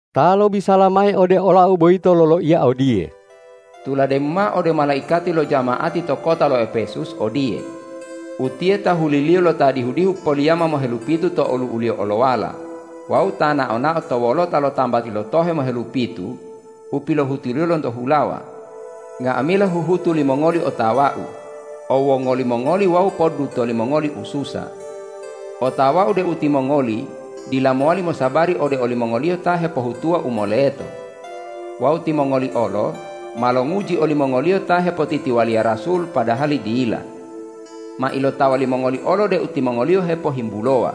Ta lobisala mayi ode olau boyito loloiya odiye: Tulademu mao ode malaikati lo jama'ati to kota lo Epesus odiye,”Utiye tahuli-Liyo lo Ta dihu-dihu poliyama mohelupitu to olu'u-Liyo olowala wawu Ta nao-nao to wolota lo tambati lo tohe mohelupitu u pilohutuliyo lonto hulawa: Nga'amila huhutu limongoli otawa-U, owwongoli mongoli wawu poddutoli mongoli ususa. Otawa-U deu timongoli dila mowali mosabari ode olimongoliyo ta hepohutuwa u moleto. Wawu timongoli olo ma longuji olimongoliyo ta hepotitiwaliya rasul padahali dila. Ma ilotawa limongoli olo deu timongoliyo hepohimbulowa.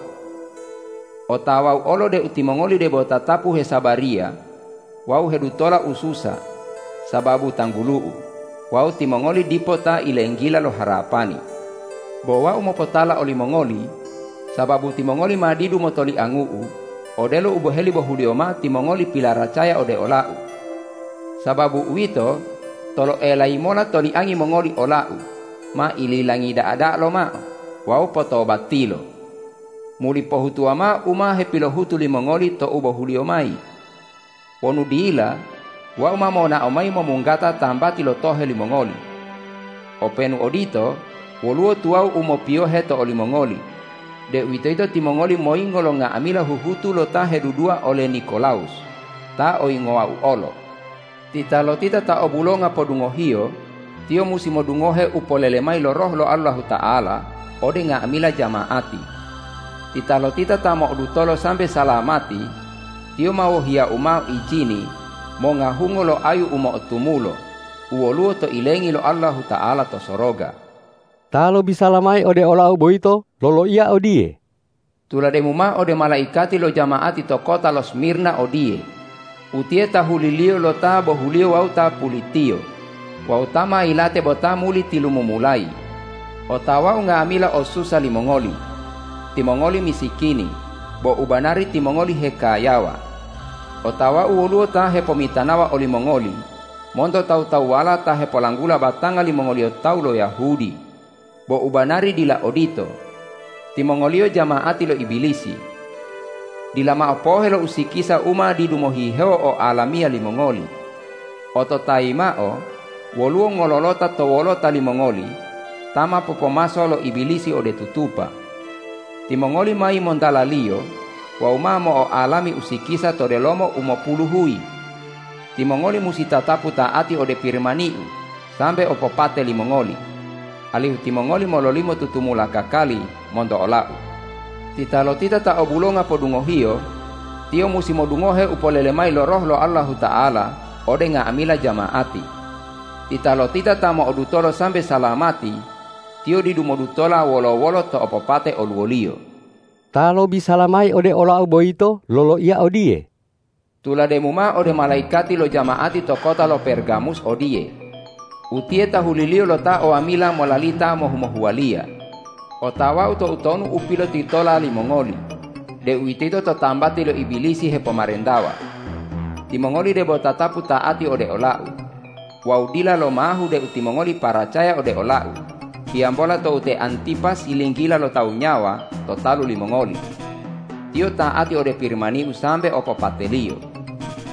Otawa-U olo deu timongoli debo tatapu hesabariya wawu hedutola ususa sababu tanggulu-U wawu timongoli dipo ta ilenggila lo harapani. Bo Wau mopotala olimongoli, sababu timongoli ma didu motoliangu-U odelo u boheli bohuliyo mao timongoli pilaracaya ode ola-U. Sababu uwito, toloelayimola toliangi mongoli ola-U ma ililangi da'a-da'a lomao wawu potobatilo. Muli pohutuwa mao u ma hepilohutu limongoli tou bohuliyo mayi. Wonu dila, Wau ma monao mayi momunggata tambati lo tohe limongoli. Openu odito, woluwo tuwawu u mopiyohe to olimongoli, deuwitoyito timongoli moyingo lo nga'amila huhutu lo ta hedudua ole Nikolawus ta oyingowa-U olo. Titalotita ta obulonga podungohiyo, tiyo musi modungohe u polele mayi lo Roh lo Allahuta'ala ode nga'amila jama'ati. Titalotita ta mo'odutolo sambe salamati, tiyo ma wohiya-U mao ijini monga hungo lo ayu u mo'otumulo u woluwo to ilengi lo Allahuta'ala to soroga.” Ta lobisala mayi ode olau boyito loloiya odiye: Tulademu mao ode malaikati lo jama'ati to kota lo Smirna odiye,”Utiye tahuli-Liyo lo Ta bohuliyo wawu Ta pulitiyo wawu Ta ma yilate bo Ta muli tilumumulayi: Otawa-U nga'amila ossusa limongoli. Timongoli misikini, bo u banari timongoli hekayawa. Otawa-U woluwo ta hepomitanawa olimongoli monto tawu-tawuwala ta hepolanggula batanga limongoliyo tawu lo Yahudi, bo u banari dila odito. Timongoliyo jama'ati lo Ibilisi. Dila mao pohe lo usikisa u ma didu mohihewo oalamiya limongoli. Ototayi mao, woluwo ngololota to wolota limongoli ta ma popomaso lo Ibilisi ode tutupa. Timongoli ma yimontalaliyo wawu ma mo'oalami usikisa to delomo umopulu huyi. Timongoli musi tatapu ta'ati ode Pirimani-U sambe opopate limongoli, alihu timongoli mololimo tutumula kakali monto ola-U. Titalotita ta o bulonga podungohiyo, tiyo musi modungohe u polele mayi lo Roh lo Allahuta'ala ode nga'amila jama'ati. Titalotita ta mo'odutolo sambe salamati, tiyo didu modutola wolo-wolo to opopate oluwoliyo.” Ta lobisala mayi ode olau boyito loloiya odiye: Tulademu mao ode malaikati lo jama'ati to kota lo Pergamus odiye,”Utiye tahuli-Liyo lo Ta o wamila molalita mohu-mohuwaliya: Otawa-U toutonu u pilotitola limongoli, deuwitoyito to tambati lo Ibilisi hepomarentawa. Timongoli debo tatapu ta'ati ode ola-U wawu dila lomahu deu timongoli paracaya ode ola-U hiyambola tou te Antipas yilinggila lo tawu nyawa to talu limongoli. Tiyo ta'ati ode Pirimani-U sambe opopateliyo.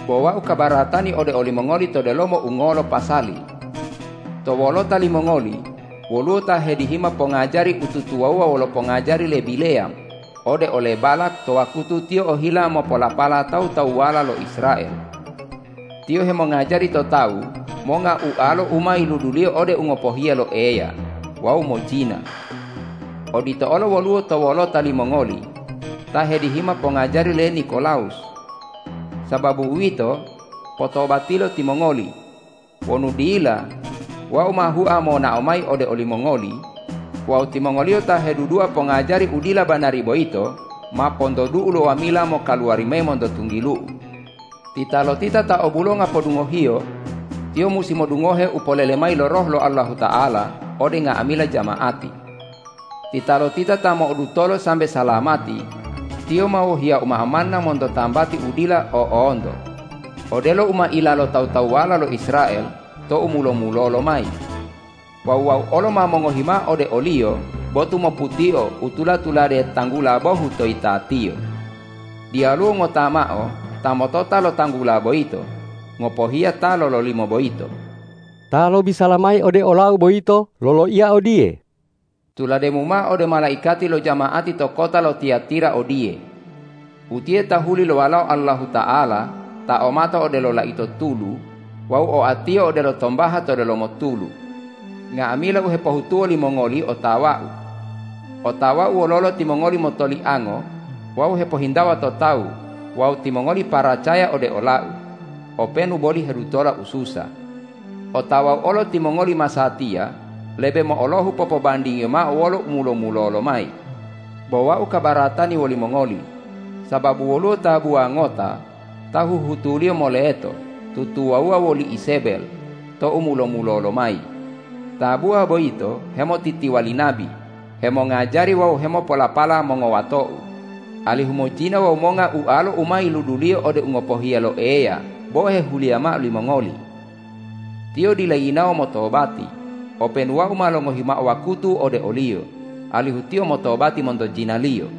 Bo Wau kabaratani ode olimongoli to delomo ungolo pasali: To wolota limongoli woluwo ta hedihima pongajari u tutuwawuwa wolo pongajari le Bileyam ode ole Balak to wakutu tiyo ohila mopolapala tawu-tawuwala lo Israel. Tiyo hemongajari to tawu monga ualo u ma yiluduliyo ode u ngopohiya lo Eya wawu mojina. Odito olo woluwo to wolota limongoli ta hedihima pongajari le Nikolawus. Sababu uwito, potobatilo timongoli! Wonu dila, Wau ma hua monao mayi ode olimongoli wawu timongoliyo ta hedudua pongajari u dila banari boyito ma pontodu-U lo wamila mokaluwari mayi monto tunggilu-U. Titalotita ta o bulonga podungohiyo, tiyo musi modungohe u polele mayi lo Roh lo Allahuta'ala ode nga'amila jama'ati. Titalotita ta mo'odutolo sambe salamati, tiyo ma wohiya-U mao manna monto tambati u dila o'onto, odelo u ma ila lo tawu-tawuwala lo Israel tou mulo-mulolo mayi. Wawu Wau olo ma mongohi mao ode oliyo botu moputio u tula-tulade tanggula bohu to yitatiyo. Diyaluwo ngota mao ta motota lo tanggula boyito ngopohiya ta lololimo boyito.” Ta lobisala mayi ode olau boyito loloiya odiye: Tulademu mao ode malaikati lo jama'ati to kota lo Tiyatira odiye,”Utiye tahuli lo Walao Allahuta'ala ta o mato odelo laito tulu wawu oa-Tiyo odelo tombaha to delomo tulu: Nga'amila u hepohutuwo limongoli otawa-U. Otawa-U wololo timongoli motoliango wawu hepohintawa to tawu wawu timongoli paracaya ode ola-U, openu boli hedutola ususa. Otawa-U olo timongoli masatiya lebe mo'olohu popobandingiyo mao wolo u mulo-mulolo mayi. Bo Wau kabaratani wolimongoli, sababu woluwo tabuwa ngota ta huhutuliyo moleto tutuwawuwa woli Izebel tou mulo-mulolo mayi. Tabuwa boyito hemotitiwali nabi hemongajari wawu hemopolapala mongowato-U, alihu mojina wawu monga ualo u ma yiluduliyo ode u ngopohiya lo Eya bo hehuliya mao limongoli. Tiyo dila yinawo motobati, openu Wau ma longohi mao wakutu ode oliyo, alihu tiyo motobati monto jinaliyo.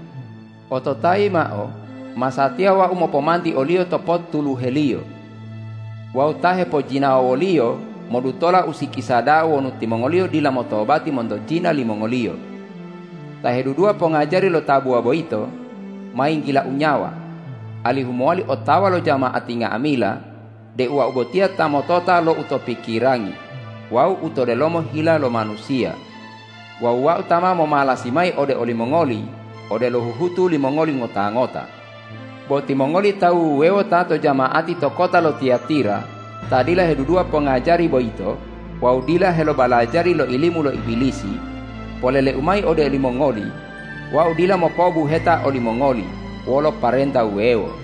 Ototayi mao, masatiya Wau mopomanti oliyo to pottuluheliyo. Wawu ta hepojinawa woliyo modutola usikisa da'a wonu timongoliyo dila motobati monto jina limongoliyo. Ta hedudua pongajari lo tabuwa boyito ma yinggila-U nyawa, alihu mowali otawa lo jama'ati nga'amila deu Wau botiya ta motota lo u to pikirangi wawu u to delomo hila lo manusiya. Wawu Wau ta ma momalasi mayi ode olimongoli odelo huhutu limongoli ngota-ngota. Bo timongoli tawu wuwewo ta to jama'ati to kota lo Tiyatira ta dila hedudua pongajari boyito wawu dila helobalajari lo ilimu lo Ibilisi, polele-U mayi ode olimongoli: Wau dila mopo'obuheta olimongoli wolo parenta wuwewo.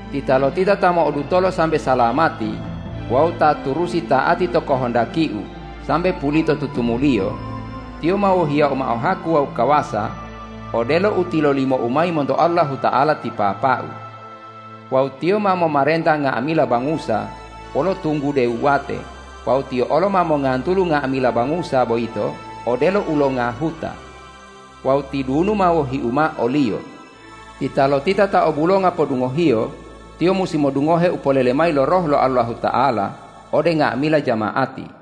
Titalotita ta mo'odutolo sambe salamati wawu ta turusi ta'ati to kohondaki-U sambe pulito tutumuliyo, tiyo ma wohiya-U mao haku wawu kawasa odelo u tilolimo-U mayi monto Allahuta'ala ti Papa-U. Wawu tiyo ma momarenta nga'amila bangusa wolo tunggude wuwate wawu tiyo olo ma mongantulu nga'amila bangusa boyito odelo ulonga huta. Wawu tidunu ma wohi-U mao oliyo. Titalotita ta o bulonga podungohiyo, tiyo musi modungohe u polele mayi lo Roh lo Allahuta'ala ode nga'amila jama'ati.”